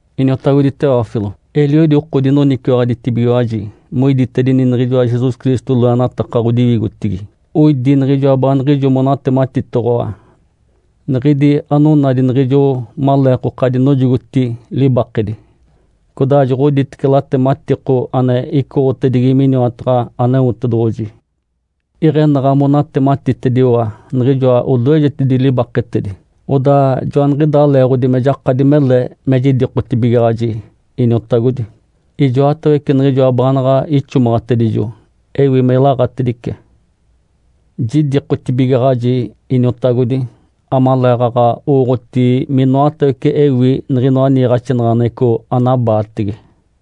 Iniotagodi Teófilo. Eliodi oko dinoniciwaɡ̶aditibigiwaji moiditedini niɡ̶ijoa Jesus Cristo loenataka ɡ̶odiwigotigi. Oidi niɡ̶ijoa baaniɡ̶ijo monatematitoɡ̶owa, niɡ̶idi anonadi niɡ̶ijo maleekoka dinojogoti libakedi, codaa joɡ̶oditece latematiko ane icoɡ̶otedigi miniwataɡ̶a Aneotedoɡ̶oji. Iɡ̶enaɡ̶a monatematitediwa niɡ̶ijoa odoejedi libaketedi, odaa joaniɡ̶idaa leeɡ̶odi me jakadi mele me jidikotibigaɡ̶aji, iniotagodi, ijoatawece niɡ̶ijoa baanaɡ̶a ixomaɡ̶atedijo, ewi me ilaɡ̶atedice. Jidikotibigaɡ̶aji, iniotagodi, amaleeɡ̶aɡ̶a owooɡ̶oti minoatawece ewi niɡ̶inoa niiɡ̶axinaɡ̶aneɡ̶eco anabaatege.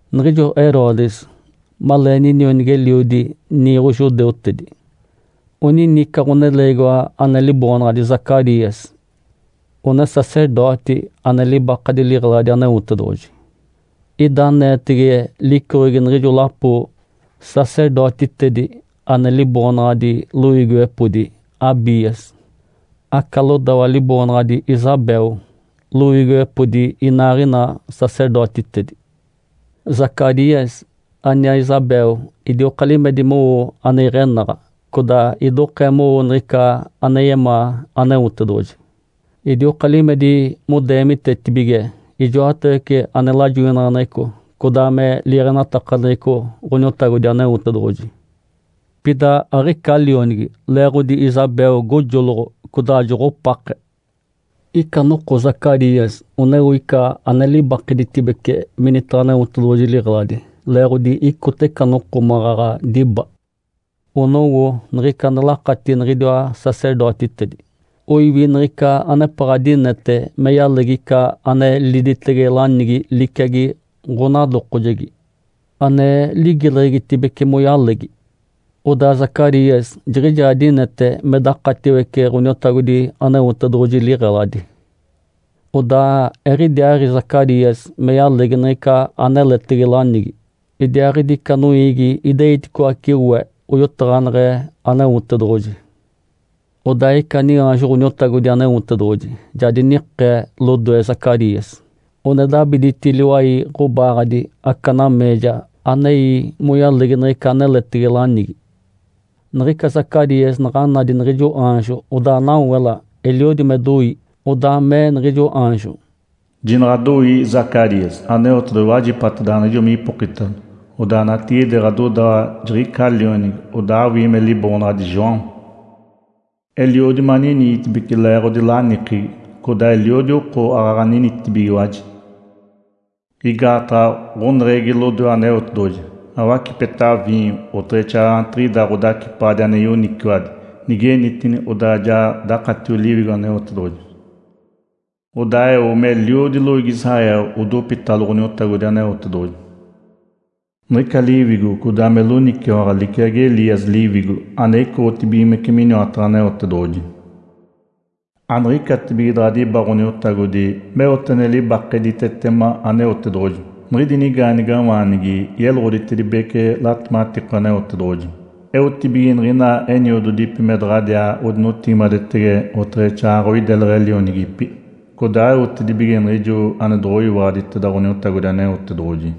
Niɡ̶ijo Herodes, malee ninionigi-eliodi niiɡ̶o judeutedi, onini ica ɡ̶oneleegiwa ane liboonaɡ̶adi Zacarias, one sacerdoti ane libakadi liɡ̶eladi Aneotedoɡ̶oji. Ida aneetege licoɡ̶egi niɡ̶ijo lapo sacerdotitedi ane liboonaɡ̶adi loiigiwepodi Abias. Aca lodawa liboonaɡ̶adi Isabel, loiigiwepodi inaaɡ̶ina sacerdotitedi. Zacarias aniaa Isabel idioka limedi mowo ane iɡ̶enaɡ̶a, codaa idokee mowo niɡ̶ica ane yemaa Aneotedoɡ̶oji. Idioka limedi modeemitetibige ijoatawece ane lajoinaɡ̶aneɡ̶eco codaa me liiɡ̶enatakaneɡ̶eco Ǥoniotagodi Aneotedoɡ̶oji. Pida aɡ̶ica lionigi, leeɡ̶odi Isabel gojoloɡ̶o, codaa joɡ̶opake. Ica noko Zacarias oneo ica ane libakeditibece minitaɡ̶a Aneotedoɡ̶oji liɡ̶eladi, leeɡ̶odi icota ica noko maɡ̶aɡ̶a diba. Onowo niɡ̶ica ane lakatigi niɡ̶idiwa sacerdotitedi, oiwi niɡ̶ica anepaɡ̶a dinete me yalegi ica ane liditege lanigi liciagi ɡ̶onadokojegi, ane ligileɡ̶egitibece moyalegi. Odaa Zacarias jiɡ̶ijaa dinete me dakatiwece Ǥoniotagodi Aneotedoɡ̶oji liɡ̶eladi. Odaa eɡ̶idiaaɡ̶i Zacarias me yalegi niɡ̶ica aneletege lanigi, idiaaɡ̶idi ica noiigi ideiticoace we, oyotaɡ̶aneɡ̶e Aneotedoɡ̶oji. Odaa ica niaanjo Ǥoniotagodi Aneotedoɡ̶oji ja dinikee lodoe Zacarias, one dabiditi liwai ɡ̶obaaɡ̶adi aca nameeja anei moyalegi niɡ̶ica aneletege lanigi. Niɡ̶ica Zacarias naɡ̶a nadi niɡ̶ijo aanjo, odaa nawela, eliodi me doi. Odaa mee niɡ̶ijo aanjo, “Jinaɡ̶adoii Zacarias! Aneotedoɡ̶oji wajipatedaɡ̶awa niɡ̶ijo me ipokitalo, odaa natigide ɡ̶adodawa jiɡ̶icaa lionigi, odaa awii me liboonaɡ̶adi João. Eliodi maniniitibeci leeɡ̶odi lanikegi, codaa eliodi oko aaɡ̶aɡ̶a ninitibigiwaji. Igaataɡ̶a ɡ̶oneɡ̶egi lodoe Aneotedoɡ̶oji. Awacipeta viinyo, oteɡ̶exaaɡ̶aɡ̶a anigetiɡ̶ida ɡ̶odacipaɡ̶adi ane yoniciwadi. Nigenitini, odaa ja dakatiogi Liwigo Aneotedoɡ̶oji. Odaa eo meliodi loiigi Israel odopitalo Ǥoniotagodi Aneotedoɡ̶oji. Niɡ̶ica liwigo codaa me loniciwaɡ̶a liciagi Elias liwigo ane icoɡ̶otibigimece miniwataɡ̶a Aneotedoɡ̶oji. Aniɡ̶icatibige daɡ̶a diba Ǥoniotagodi meote ane libakeditetema Aneotedoɡ̶oji, niɡ̶idi nigaanigawaanigi yeloɡ̶oditedibece latematiko Aneotedoɡ̶oji, eotibige niɡ̶ina eniododipi me daɡ̶adiaa odinotigimadetege oteɡ̶exaaɡ̶aɡ̶a oideleɡ̶e lionigipi, codaa eotibige niɡ̶ijo ane doɡ̶oyiwaɡ̶aditeda Ǥoniotagodi Aneotedoɡ̶oji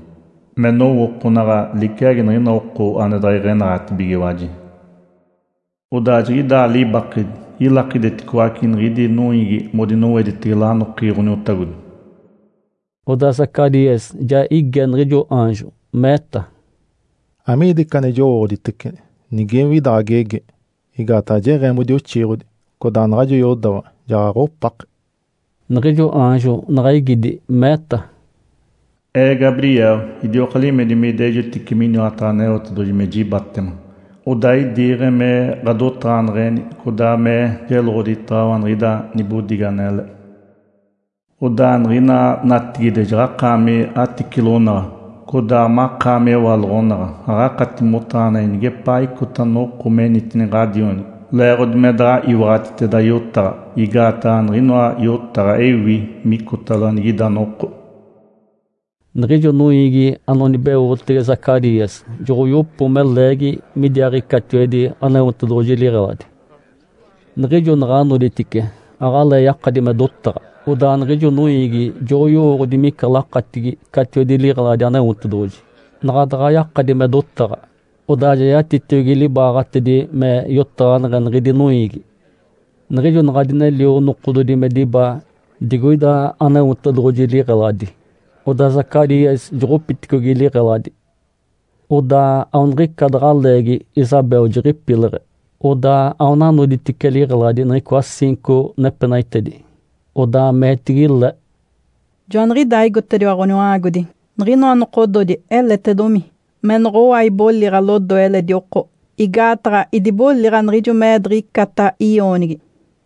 me nowookonaɡ̶a liciagi niɡ̶ina oko ane iɡ̶enaɡ̶atibigiwaji. Odaa jiɡ̶idaa libakedi, ilakideticoace niɡ̶idi noiigi modinoweditege lanokegi Ǥoniotagodi.” Odaa Zacarias ja ige niɡ̶ijo aanjo, meeta, “Amiida ica ane jowooɡ̶oditece nigewi ida ɡ̶agegi? Igaataɡ̶a jeɡ̶eemoda oxiiɡ̶odi, codaa naɡ̶ajo yodawa jaɡ̶aɡ̶a opake.” Niɡ̶ijo aanjo naɡ̶a igidi, meeta, “Ee Gabriel. Idioka limedi me idejotice miniwataɡ̶a Aneotedoɡ̶oji me jibatema. Odaa idiiɡ̶e me ɡ̶adotaɡ̶aneɡ̶eni codaa me jeloɡ̶oditaɡ̶awa niɡ̶ida nibodigi anele. Odaa niɡ̶ina natigide jaɡ̶akaami aticilonaɡ̶a, codaa makaami ewaloɡ̶onaɡ̶a, aɡ̶akati motaɡ̶ani nigepaa icota noko menitini ɡ̶adionigi, leeɡ̶odi me daɡ̶a iwaɡ̶atiteda yotaɡ̶a, igaataɡ̶a niɡ̶inoa yotaɡ̶a ewi micotalo anigida noko.” Niɡ̶ijo noiigi anonibeotege Zacarias joɡ̶oyopo me leegi midiaaɡ̶i catiwedi Aneotedoɡ̶oji liɡ̶eladi. Niɡ̶ijo naɡ̶a noditice, aɡ̶alee yakadi me dotaɡ̶a. Odaa niɡ̶ijo noiigi joɡ̶oyowooɡ̶odi mica lakatigi catiwedi liɡ̶eladi Aneotedoɡ̶oji. Naɡ̶a daɡ̶a yakadi me dotaɡ̶a, odaa ja yatitiogi libaaɡ̶atedi me yotaɡ̶aneɡ̶e niɡ̶idi noiigi. Niɡ̶ijo naɡ̶a dinelio nokododi me diba digoida Aneotedoɡ̶oji liɡ̶eladi, odaa Zacarias joɡ̶opiticogi liɡ̶eladi. Odaa aoniɡ̶ica daɡ̶a leegi Isabel jiɡ̶ipileɡ̶e. Odaa aona noditice liɡ̶eladi niɡ̶icoa ciinco nepenaitedi. Odaa meetigi le, “Joaniɡ̶idaa igotediwa Ǥoniwa-aagodi. Niɡ̶inoa nokododi eletedomi me noɡ̶owa iboliɡ̶a lodoe eledi oko. Igaataɡ̶a idiboliɡ̶a niɡ̶ijo me-ee diɡ̶icata i-oonigi.”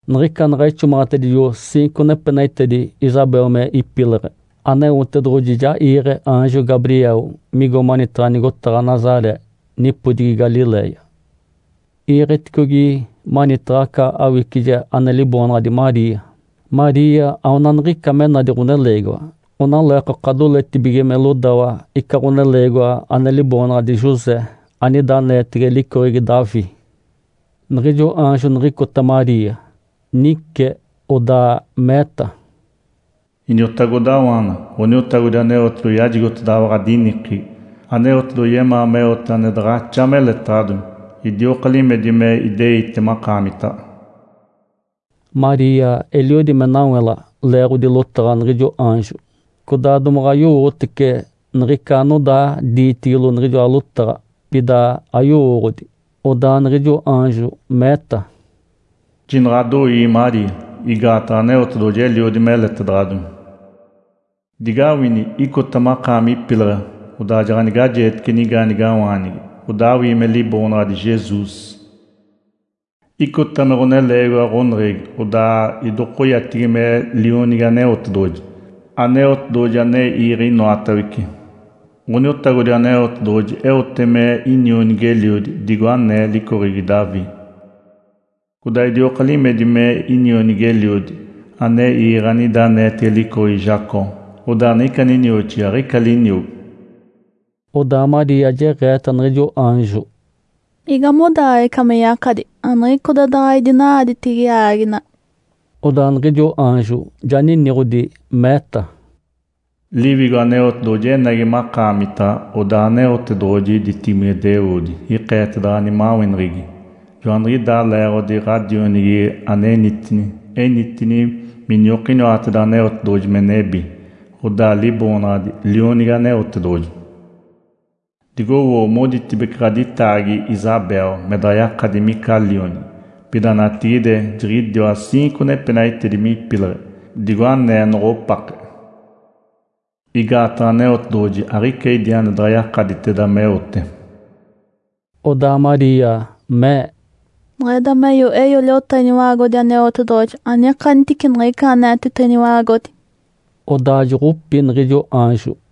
Niɡ̶ica naɡ̶a ixomaɡ̶atedijo ciinco nepenaitedi Isabel me ipileɡ̶e, Aneotedoɡ̶oji ja iiɡ̶e aanjo Gabriel migo manitaɡ̶a nigotaɡ̶a Nazaré, nipodigi Galiléia. Iiɡ̶etedicogi manitaɡ̶a aca awicije ane liboonaɡ̶adi Maria. Maria aona niɡ̶ica me nadi ɡ̶oneleegiwa, onaleekoka doletibige me lodawa ica ɡ̶oneleegiwa ane liboonaɡ̶adi José, anida aneetege licoɡ̶egi Davi. Niɡ̶ijo aanjo niɡ̶icota Maria, nice, odaa meeta, “Iniotagodawaana, Ǥoniotagodi Aneotedoɡ̶oji yajigotedaɡ̶awa ɡ̶adinikegi. Aneotedoɡ̶oji yemaa meote ane daɡ̶axa meletaɡ̶adomi. Idioka limedi me ideite makaamitaɡ̶a.” Maria eliodi me nawela leeɡ̶odi lotaɡ̶a niɡ̶ijo aanjo, codaa domaɡ̶a yowotece niɡ̶ica anodaa diitigilo niɡ̶ijoa lotaɡ̶a, pida ayowooɡ̶odi. Odaa niɡ̶ijo aanjo meeta, “Jinaɡ̶adoii Maria! Igaataɡ̶a Aneotedoɡ̶oji eliodi meletedaɡ̶adomi. Digawini! Icota makaami ipileɡ̶e, odaa jaɡ̶anigajeetece nigaanigawaanigi, odaa awii me liboonaɡ̶adi Jesus. Icota me ɡ̶oneleegiwa ɡ̶oneɡ̶egi, odaa idokoyatigi me Lionigi Aneotedoɡ̶oji, Aneotedoɡ̶oji ane iiɡ̶e inoatawece. Ǥoniotagodi Aneotedoɡ̶oji eote me inionigi-eliodi, digo anee licoɡ̶egi Davi. Codaa idioka limedi me inionigi-eliodi ane iiɡ̶e anida aneetege licoɡ̶egi Jacó, odaa niɡ̶ica ninioxigi aɡ̶ica liniogo.” Odaa Maria jeɡ̶eeta niɡ̶ijo aanjo, “Igamodaaɡ̶ee ica me yakadi? Aniɡ̶icoda daɡ̶a idina-aaditege aaginaɡ̶a.” Odaa niɡ̶ijo aanjo ja niniɡ̶odi, meeta, “Liwigo Aneotedoɡ̶oji enagi makaamita, odaa Aneotedoɡ̶oji ditibigimedeoodi ikeetedaɡ̶awa nimaweneɡ̶egi. Joaniɡ̶idaa leeɡ̶odi ɡ̶adionigi anenitini, enitini miniokiniwateda Aneotedoɡ̶oji me nebi, odaa liboonaɡ̶adi ‘Lionigi Aneotedoɡ̶oji’. Digowoo! Moditibece ɡ̶aditaagi Isabel me daɡ̶a yakadi mica lionigi, pida natigide jiɡ̶idiwa ciinco nepenaitedi me ipileɡ̶e, digo anee noɡ̶opake. Igaataɡ̶a Aneotedoɡ̶oji aɡ̶ica idi ane daɡ̶a yakaditeda meote.” Odaa Maria mee, “Niɡ̶ida meeyo, eeyo liota Iniwa-aagodi Aneotedoɡ̶oji. Anikanitici niɡ̶ica aneeteta Iniwa-aagodi.” Odaa joɡ̶opi niɡ̶ijo aanjo.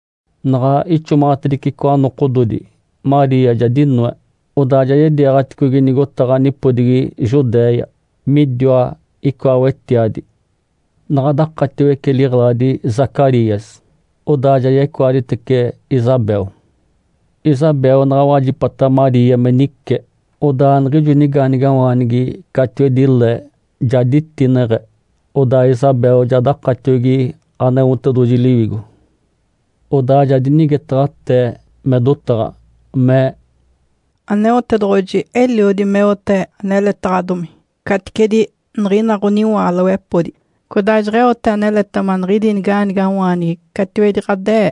Naɡ̶a ixomaɡ̶atedice icoa nokododi, Maria ja dinoe, odaa ja yediiɡ̶aticogi nigotaɡ̶a nipodigi Judéia, midiwa icoa wetiadi. Naɡ̶a dakatiwece liɡ̶eladi Zacarias, odaa ja yecoaditece Isabel. Isabel naɡ̶a wajipata Maria me nice, odaa niɡ̶ijo nigaanigawaanigi catiwedi le ja ditineɡ̶e. Odaa Isabel ja dakatiogi Aneotedoɡ̶oji Liwigo. Odaa ja dinigetaɡ̶atee me dotaɡ̶a, mee, “Aneotedoɡ̶oji eliodi meote aneletaɡ̶adomi, caticedi niɡ̶ina ɡ̶oniwaalowepodi, codaa jeɡ̶eote aneletema niɡ̶idi niga-aanigawaanigi catiwedi ɡ̶ade-ee.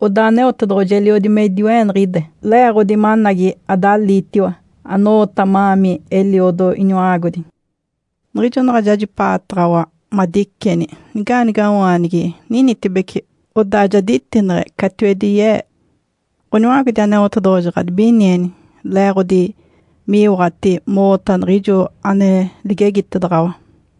Odaa Aneotedoɡ̶oji eliodi me idiwe-eeniɡ̶ide, le-eeɡ̶odi managi adaliitiwa, ano-oota ma-aami eliodo Iniwa-aagodi. Niɡ̶ijo naɡ̶a jajipa-aataɡ̶awa madiceni, niga-aanigawaanigi ninitibece, odaa ja ditineɡ̶e catiwedi ye-ee. Ǥoniwa-aagodi Aneotedoɡ̶oji ɡ̶adibinieni le-eeɡ̶odi mi-iiwaɡ̶ati mo-oota niɡ̶ijo ane ligegitedaɡ̶awa.”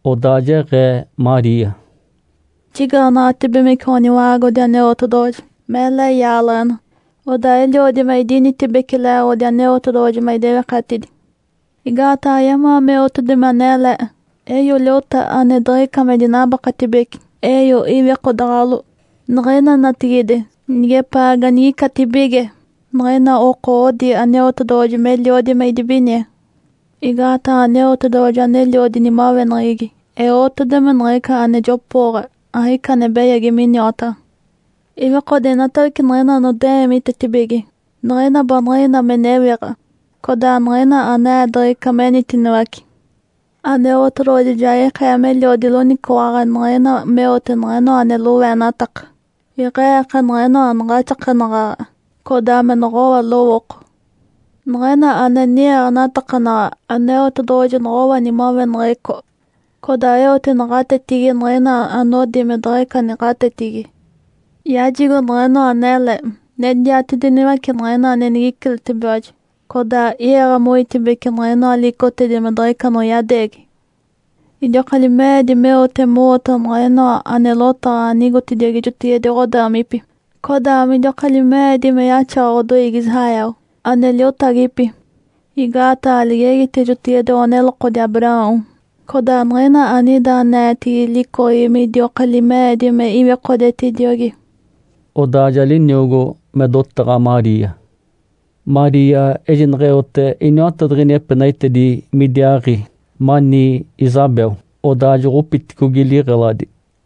Odaa jeɡ̶ee Maria, “Jigaanaɡ̶atibigimece Ǥoniwa-aagodi Aneotedoɡ̶oji, mele yaaleɡ̶ena. Odaa eliodi me idinitibeci le-eeɡ̶odi Aneotedoɡ̶oji me idewikatidi. Igaataɡ̶a yemaa meotedomi anele, eeyo liota ane diɡ̶ica me dinabaketibece, eeyo iwikodaɡ̶alo. Niɡ̶ina natigide, nigepaa ganigicatibige, niɡ̶ina oko odi Aneotedoɡ̶oji meliodi me idibinie. Igaataɡ̶a Aneotedoɡ̶oji aneliodi nimaweneɡ̶egi, eotedomi niɡ̶ica ane jopooɡ̶a. Aɡ̶ica ane beyagi miniwataɡ̶a. Iwikode inatawece niɡ̶ina anode-eemitetibige, niɡ̶ina baaniɡ̶ina me newiɡ̶a, codaa niɡ̶ina ane-eediɡ̶ica menitiniwace. Aneotedoɡ̶oji ja ikee meliodi loniciwaɡ̶a niɡ̶ina meote niɡ̶inoa ane loweenataka. Iɡ̶e-eeke niɡ̶inoa anaɡ̶axakenaɡ̶aɡ̶a, codaa me noɡ̶owa lowooko. Niɡ̶ina ane ni-iiɡ̶enatakanaɡ̶a, Aneotedoɡ̶oji noɡ̶owa nimaweneɡ̶eco, codaa eote naɡ̶atetigi niɡ̶ina anodi me diɡ̶ica naɡ̶atetigi. Yajigo niɡ̶inoa anele, nediatediniwace niɡ̶ina ane nigiciletibigiwaji, codaa i-iiɡ̶e moitibece niɡ̶inoa liicotedi me diɡ̶ica anoyadeegi. Idioka lime-eedi meote mo-oota niɡ̶inoa ane lotaɡ̶a anigotediogi jotigide ɡ̶odaamipi, codaa midioka lime-eedi me yaxawa ɡ̶odoiigi Israel, ane liotagipi. Igaataɡ̶a ligegite jotigide ɡ̶onelokodi Abraão, codaa niɡ̶ina anida aneetege licoɡ̶egi midioka lime-eedi me iwikodetediogi.” (Odaa ja liniogo me dotaɡ̶a Maria). Maria ejinaɡ̶a eote iniwatadiɡ̶ini epenaitedi midiaaɡ̶i mani Isabel, odaa joɡ̶opiticogi liɡ̶eladi.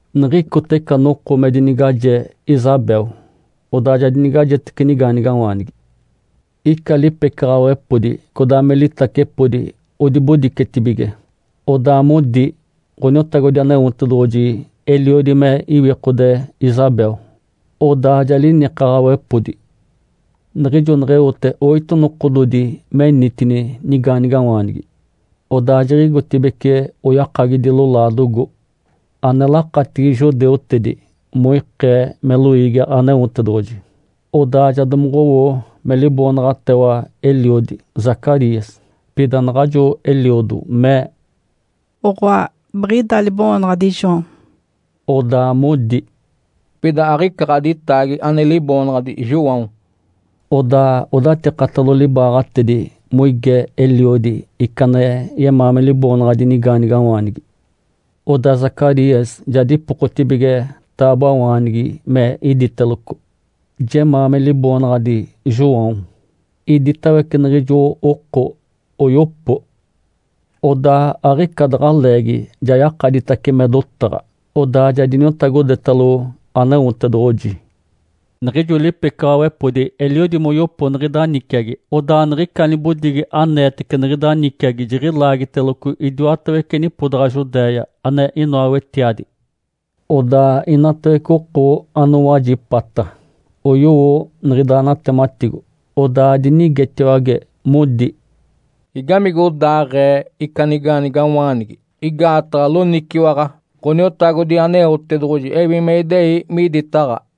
Niɡ̶icota ica noko me dinigaje Isabel, odaa ja dinigajetece nigaanigawaanigi. Ica lipecaɡ̶awepodi codaa me litacepodi odibodicetibige, odaa modi Ǥoniotagodi Aneotedoɡ̶oji eliodi me iwikode Isabel. Odaa ja linikaɡ̶awepodi. Niɡ̶ijo neɡ̶eote oito nokododi menitini nigaanigawaanigi, odaa jiɡ̶igotibeci oyakagidi lolaadogo, ane lakatigi judeutedi (moikee me loiigi Aneotedoɡ̶oji). Odaa ja domoɡ̶owo me liboonaɡ̶atewa eliodi, Zacarias. Pida naɡ̶ajo eliodo mee, “Oɡ̶oa, biɡ̶ida liboonaɡ̶adi João.” Odaa modi, “Pida aɡ̶ica ɡ̶aditaagi ane liboonaɡ̶adi João!” Odaa odatikatalo libaaɡ̶atedi moige eliodi ica ane yemaa me liboonaɡ̶adi nigaanigawaanigi. Odaa Zacarias ja dipokotibige taaboawaanigi me iditeloco, “Jemaa me liboonaɡ̶adi João.” Iditawece niɡ̶ijo oko oyopo. Odaa aɡ̶ica daɡ̶a leegi ja yakaditace me dotaɡ̶a, odaa ja diniotagodetalo Aneotedoɡ̶oji. Niɡ̶ijo lipecaɡ̶awepodi eliodi moyopo niɡ̶ida niciagi, odaa niɡ̶ica nibodigi aneetece niɡ̶ida niciagi jiɡ̶ilaagiteloco idiwatawece nipodaɡ̶a Judéia, ane inoa wetiadi. Odaa inatawece oko anowajipata oyowo niɡ̶ida natematigo, odaa dinigetiwage, modi, “Igamigodaaɡ̶ee ica nigaanigawaanigi? Igaataɡ̶a loniciwaɡ̶a Ǥoniotagodi Aneotedoɡ̶oji ewi me idei miditaɡ̶a.”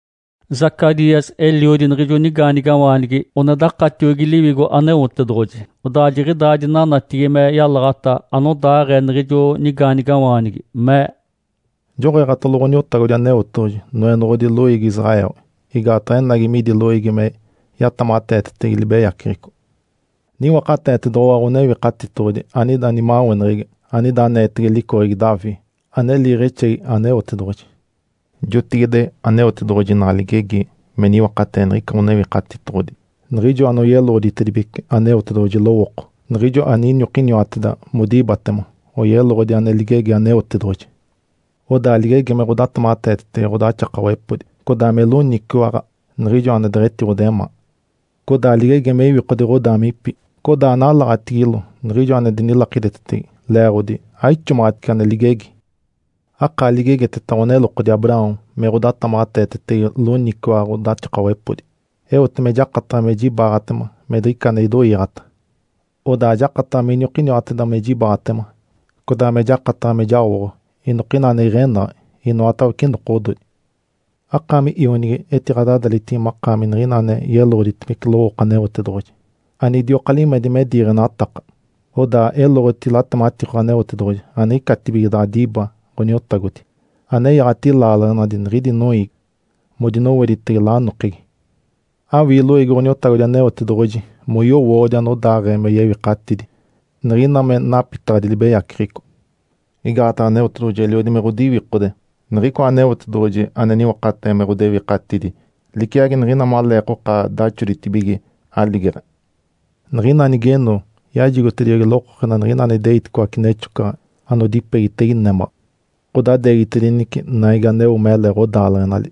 Zacarias, eliodi niɡ̶ijo nigaanigawaanigi one dakatiogi Liwigo Aneotedoɡ̶oji, odaa jiɡ̶idaa dinanatigi me yalaɡ̶ata anodaaɡ̶ee niɡ̶ijo nigaanigawaanigi, mee, “Joɡ̶eeɡ̶atalo Ǥoniotagodi Aneotedoɡ̶oji, Noenoɡ̶odi loiigi Israel. Igaataɡ̶a enagi midi loiigi me yatamaɡ̶ateetetege libeyaceɡ̶eco. Niwakateetedoɡ̶owa Ǥonewikatitoɡ̶odi anida nimaweneɡ̶egi, anida aneetege licoɡ̶egi Davi, ane liiɡ̶exegi Aneotedoɡ̶oji. Jotigide Aneotedoɡ̶oji naɡ̶a ligegi me niwakatee niɡ̶ica Ǥonewikatitoɡ̶odi. Niɡ̶ijo anoyeloɡ̶oditedibece Aneotedoɡ̶oji lowooko, niɡ̶ijo aniniokiniwateda modibatema, oyeloɡ̶odi ane ligegi Aneotedoɡ̶oji. Odaa ligegi me ɡ̶odatamaɡ̶ateetetege ɡ̶odaxakawepodi, codaa me loniciwaɡ̶a niɡ̶ijo ane deɡ̶etiɡ̶odemaa. Codaa ligegi me iwikode ɡ̶odaamipi, codaa nalaɡ̶atigilo niɡ̶ijo ane dinilakidetetege, leeɡ̶odi aixomaɡ̶atice ane ligegi. Akaa ligegiteta ɡ̶onelokodi Abraão me ɡ̶odatamaɡ̶ateetetege loniciwaɡ̶a ɡ̶odaxakawepodi, eote me jakataɡ̶a me jibaaɡ̶atema me diɡ̶ica ane idoiiɡ̶ata. Odaa jakataɡ̶a miniokiniwateda me jibaaɡ̶atema, codaa me jakataɡ̶a me jaoɡ̶o inokina ane iɡ̶enaɡ̶a inoatawece nokododi. Akaami, ionigi, etiɡ̶adadalitigi makaami niɡ̶ina ane yeloɡ̶oditedibece lowooko Aneotedoɡ̶oji anidioka limedi me diiɡ̶enataka. Odaa eloɡ̶oti latematiko Aneotedoɡ̶oji aniɡ̶icatibige daɡ̶a diba Ǥoniotagodi, anenyaɡ̶ati laaleɡ̶enali niɡ̶idi noiigi modinoweditege lanokegi. Awii loiigi Ǥoniotagodi Aneotedoɡ̶oji moyowooɡ̶odi anodaaɡ̶ee me yewikatidi, niɡ̶ina me napitaɡ̶adi libeyaceɡ̶eco. Igaataɡ̶a Aneotedoɡ̶oji eliodi me ɡ̶odiwikode. Niɡ̶icoa Aneotedoɡ̶oji ane niwakatee me ɡ̶odewikatidi liciagi niɡ̶ina maleekoka daxoditibige aligeɡ̶e. Niɡ̶ina nigeno, yajigotediogi lokokena niɡ̶ina ane ideiticoace nexocaɡ̶a anodipegitege némaɡ̶a, ɡ̶odadeegitedinece naigi aneo mele ɡ̶odaaleɡ̶enali.”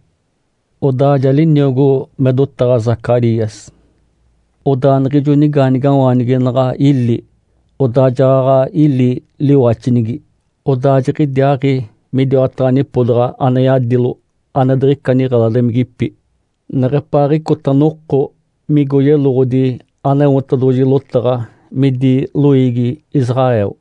(Odaa ja liniogo me dotaɡ̶a Zacarias). Odaa niɡ̶ijo nigaanigawaanigi naɡ̶a ili, odaa jaɡ̶aɡ̶a ili liwaxinigi. Odaa jiɡ̶idiaaɡ̶i midiwataɡ̶a nipodaɡ̶a ane yadilo ane diɡ̶ica niɡ̶eladimigipi neɡ̶epaaɡ̶icota noko migo yeloɡ̶odi Aneotedoɡ̶oji lotaɡ̶a midi loiigi Israel.